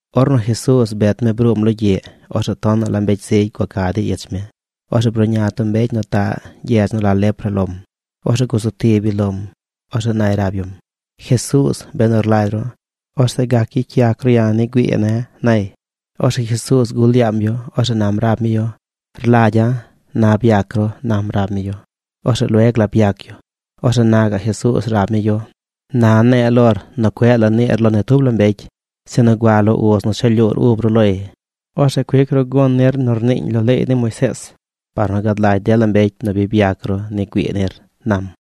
Ornu Jesuuz bet mi nu bruum logyiꞌ, orzeꞌ tonaꞌ la mbecy zigy gua ca dey ich mi. Orzeꞌ bruꞌña tub mbecy nu taꞌ gyedz nu la lepra lom. Orzeꞌ gusu tib yu lom. Orzeꞌ nay rab yum: ―Jesuuz, benu rlagy ru, orzeꞌ gac gyicy yac ru ya̱ ni güii ne̱ ―nay. Orzeꞌ Jesuuz gul yaam yu. Orzeꞌ nam rab mi yu: ―Rlagya̱. Na byac ru ―nam rab mi yu. Orzeꞌ lueg la byac yu. Orzeꞌ na gaꞌ Jesuuz rab mi yu: ―Na ne̱e̱ lor nu cueꞌ la niir lo ni tub la mbecy, sinu gua lo uz nu cha lyuur ub ru loy. Orzeꞌ cuic ru gun nir nu rniiñ lo leey ni Moisees par nu gad lagy dela mbecy nu bi byac ru ni güii nir ―nam.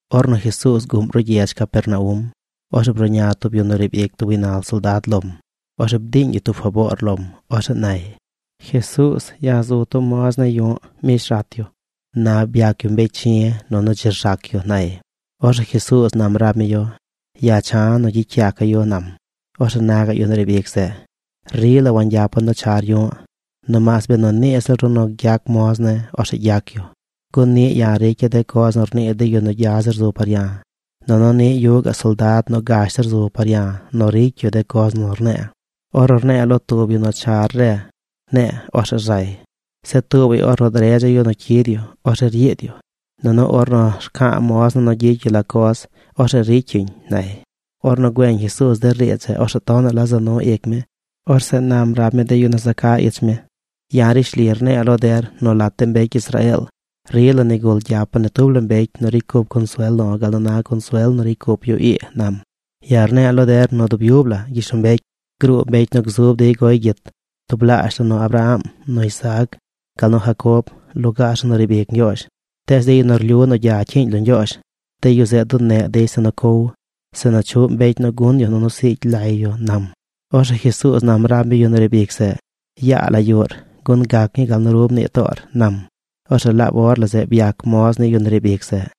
Ornu Jesuuz guꞌm ruꞌ gyedz Capernaum, orzeꞌ bruꞌña tub yu nu riib ic tub gaynal soldad lom. Orzeꞌ bdiiñ yu tub faboor lom. Orzeꞌ nay: ―Jesuuz, ya̱ zu tub moz ne̱ yu̱ꞌ mbish rat yu. Na byac yu mbecy chi̱ nunu dzi rzac yu ―nay. Orzeꞌ Jesuuz nam rab mi yu: ―Ya̱ cha̱ nu gyicy yaca̱ yu ―nam. Orzeꞌ na gaꞌ yu nu riib ic zeꞌ: ―Rila wangyapa̱ nu char yu̱ꞌ, nomaas benu nii ziꞌl ru nu gyac moz ne̱, orzeꞌ gyac yu. Gun niꞌ ya̱ ricya̱ de coz nu rnii de yu nu gya zir zu par ya̱. Nunu niꞌ yuꞌ gaꞌ soldad nu gash zir zu par ya̱ nu ricy yu de coz nu rne̱e̱. Ornu rne̱e̱ lo tub yu nu “Char re”, ne̱e̱, orzeꞌ rzay. Zeꞌ tuubay, ornu dredza̱ yu nu cyid yu, orzeꞌ ryiid yu. Nunu ornu rca̱a̱ moz ne̱ nu gyicy yu la coz, orzeꞌ ricy yuñ ―nay. Ornu güeñ Jesuuz de riidz zeꞌ, orzeꞌ tonaꞌ la za nu ic mi. Orzeꞌ nam rab mi de yu nu za ca ich mi: ―Ya̱ rishli rne̱e̱ lo der nu lat de mbecy Israeel rila nigul gyapa̱ ni tub la mbecy nu ricy cup consuel lo̱ gal nu na consuel nu ricy cup yu ii ―nam―. Ya̱ rne̱e̱ lo der nu dub yub la gyishlombecy gruu mbecy nu gzub dey goy gyit tublaazh la nu Abraham, nu Isaac gal nu Jacob lugaar zeꞌ nu riib ic Ñgyoozh. Tees de yu nu rlyu nu gya cyiiñ lo Ñgyoozh, de yu zeꞌ duneꞌ dey zeꞌ nu cow, zeꞌ nu chuꞌ mbecy nu gun yu nunu nu siigy lay yu ―nam. Orzeꞌ Jesuuz nam rab mi yu nu riib ic zeꞌ: ―Yaa la yuꞌr, gun gac ñii gal nu ru mnii toor ―nam. Orzeꞌ laab or la zeꞌ byac moz ni yu nu riib ic zeꞌ.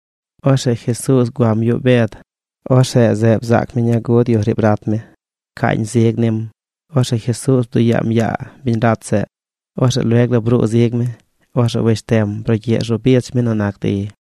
Orzeꞌ Jesuuz guam yuꞌ Bed. Orzeꞌ zeꞌ bzaac mi ñaa gud yu riib rat mi. Pcaañ zig nim. Orzeꞌ Jesuuz bduꞌ yaam yaa biñ rat zeꞌ. Orzeꞌ lueg la bruu zig mi. Orzeꞌ wesh tem brugyiꞌ rzu bich mi nu nac dey.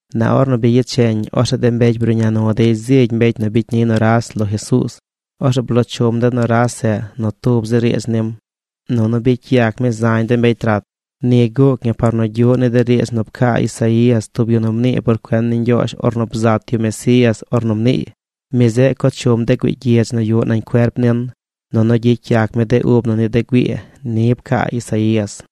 Na ornu bi yecheñ, orzeꞌ de mbecy bruꞌña nu dey zigy mbecy nu bicy ni nuras lo Jesuuz. Orzeꞌ bloo chum de nuras zeꞌ nu tub zi riidz nim. Nunu bicy yac mi zañ de mbecy rat. Ni guuc ñi par nu gyuꞌ ni de riidz nu pcaa Isaías, tub yu nu mnii por cuen ni Ñgyoozh ornu bzat yu Mesías ornu mniiy: “Mi zeꞌ co chum de güii gyidz nu yuꞌ nañ cuerp nin, nunu gyicy yac mi de ub na ni de güii.” Ni pcaa Isaías.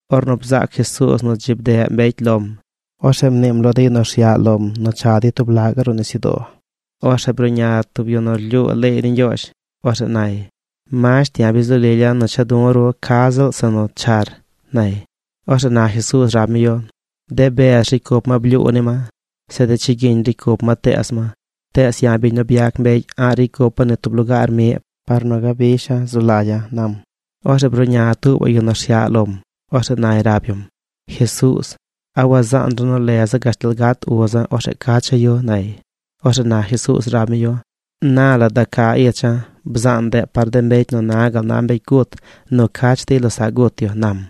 Ornu bzaac Jesuuz nu dzi bdeꞌ mbecy lom, orzeꞌ mniim lo de yu rsyaꞌ lom nu cha dey tub laꞌ gaꞌ ruꞌ nisyudoo. Orzeꞌ bruꞌña tub yu nu rlyuu leey ni Ñgyoozh. Orzeꞌ nay: ―Masht, ya̱ bi zu lilya̱ nu cha du̱ ru ca ziꞌl zeꞌ nu char ―nay. Orzeꞌ na Jesuuz rab mi yu: ―De bez ricy cup ma blyuu ni ma. Zeꞌ de chigyiñ ricy cup ma teez ma. Tees ya̱, biñ nu byac mbecy, a̱ꞌ ricy cupa̱ ni tub lugaar miꞌ par nu gabisha̱ zu lagya̱ ―nam. Orzeꞌ bruꞌña tuubaꞌ yu nu rsyaꞌ lom. Orzeꞌ nay rab yum: ―Jesuuz, ¿a wazaan ru nu leza̱ gashtal gat uza̱? Orzeꞌ cacha̱ yu ―nay. Orzeꞌ na Jesuuz rab mi yu: ―Na la da ca icha̱. Bzaan ndeꞌ par de mbecy nu na gal na mbecy gut nu cach dey losaꞌ gut yu ―nam.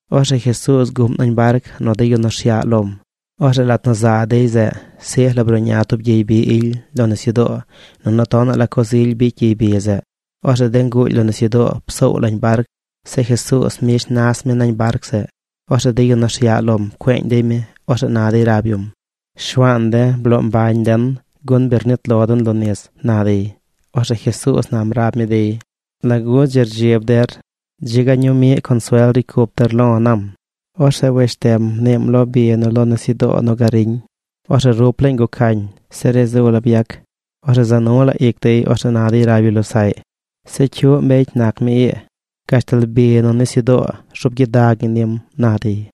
Orzeꞌ Jesuuz guꞌm nañ barc nu de yu nu rsyaꞌ lom. Orzeꞌ lat nu za dey zeꞌ, sij la bruꞌña tub gyey bi ily lo nisyudoo, nunu tonaꞌ la coz ily bicy gyey bi zeꞌ. Orzeꞌ de nguuly lo nisyudoo psoow lañ barc. Zeꞌ Jesuuz mbish mi nas mi nañ barc zeꞌ. Orzeꞌ de yu nu rsyaꞌ lom pcueeñ dey mi. Orzeꞌ na dey rab yum: ―¡Shuaan de̱, bloo mbañ den! Gun bi rnit lo den lo nis ―na dey. Orzeꞌ Jesuuz nam rab mi dey: ―¿Lagu dzi rdzib der? ¡Dzi ga ñuu miꞌ consuel ricy cup der lo̱! ―nam. Orzeꞌ wesh tem mniim lo bi nu lo nisyudoo nu gariñ. Orzeꞌ rup laañ gucañ. Se ri zu la byac. Orzeꞌ za nu la ic dey. Orzeꞌ na dey rab yu losaꞌy: ―¿Zeꞌ cyuꞌ mbecy nac mi ii? Gashtal bi nu nisyudoo rzuub gyidag ñi nim ―na dey.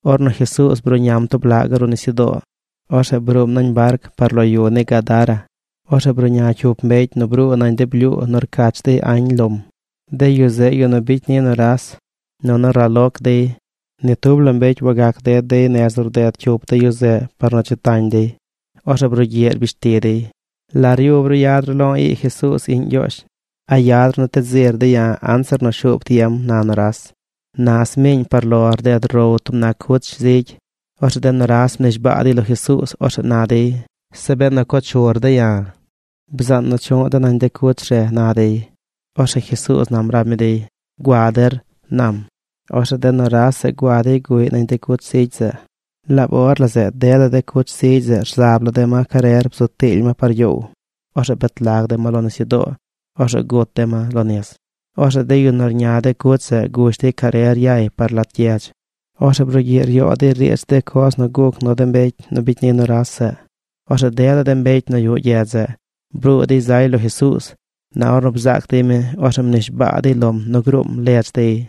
Ornu Jesuuz bruꞌñam tub laꞌ gaꞌ ruꞌ nisyudoo, orzeꞌ bruum nañ barc par lo yu ni Gadara. Orzeꞌ bruꞌña cyup mbecy nu bruu nañ de blyuu nu rcach dey añ lom. De yu zeꞌ yu nu bicy ni nuras. Nunu raloc dey. Ni tub la mbecy wagac ded dey nez nu rded cyup de yu zeꞌ par nu dzi tañ dey. Orzeꞌ brugyiꞌ rbish ti dey: ―¿La ryub ru yad ru lo̱ ii Jesuuz iꞌñ Ñgyoozh? ¿A yad ru nu ted zir de̱ ya̱ anzir nu shuub tiem? ―na nuras. Na sñuu miiñ par lo rded row tub nac cuch zigy. Orzeꞌ de nuras mnishbaa dey lo Jesuuz. Orzeꞌ na dey: ―Zeꞌ benu co chur de̱ ya̱, bzaan nu chuꞌ de̱ nañ de cuch re ―na dey. Orzeꞌ Jesuuz nam rab mi dey: ―Gua der ―nam. Orzeꞌ de nuras zeꞌ gua dey guꞌy nañ de cuch zigy zeꞌ. Laab or la zeꞌ dela de cuch zigy zeꞌ rzab la de ma carer bzu tiily ma par gyoow. Orzeꞌ bet lag de ma lo nisyudoo. Orzeꞌ gut de ma lo nis. Orzeꞌ de yu nu rña de cuch zeꞌ gush dey carer yay par lat gyedz. Orzeꞌ brugyiꞌ ryoo dey riidz de coz nu guc nu de mbecy nu bicy ni nuras zeꞌ. Orzeꞌ dela de mbecy nu yuꞌ gyedz zeꞌ bruu dey zay lo Jesuuz. Na ornu bzaac dey mi, orzeꞌ mnishbaa dey lom nu gruum ledz dey.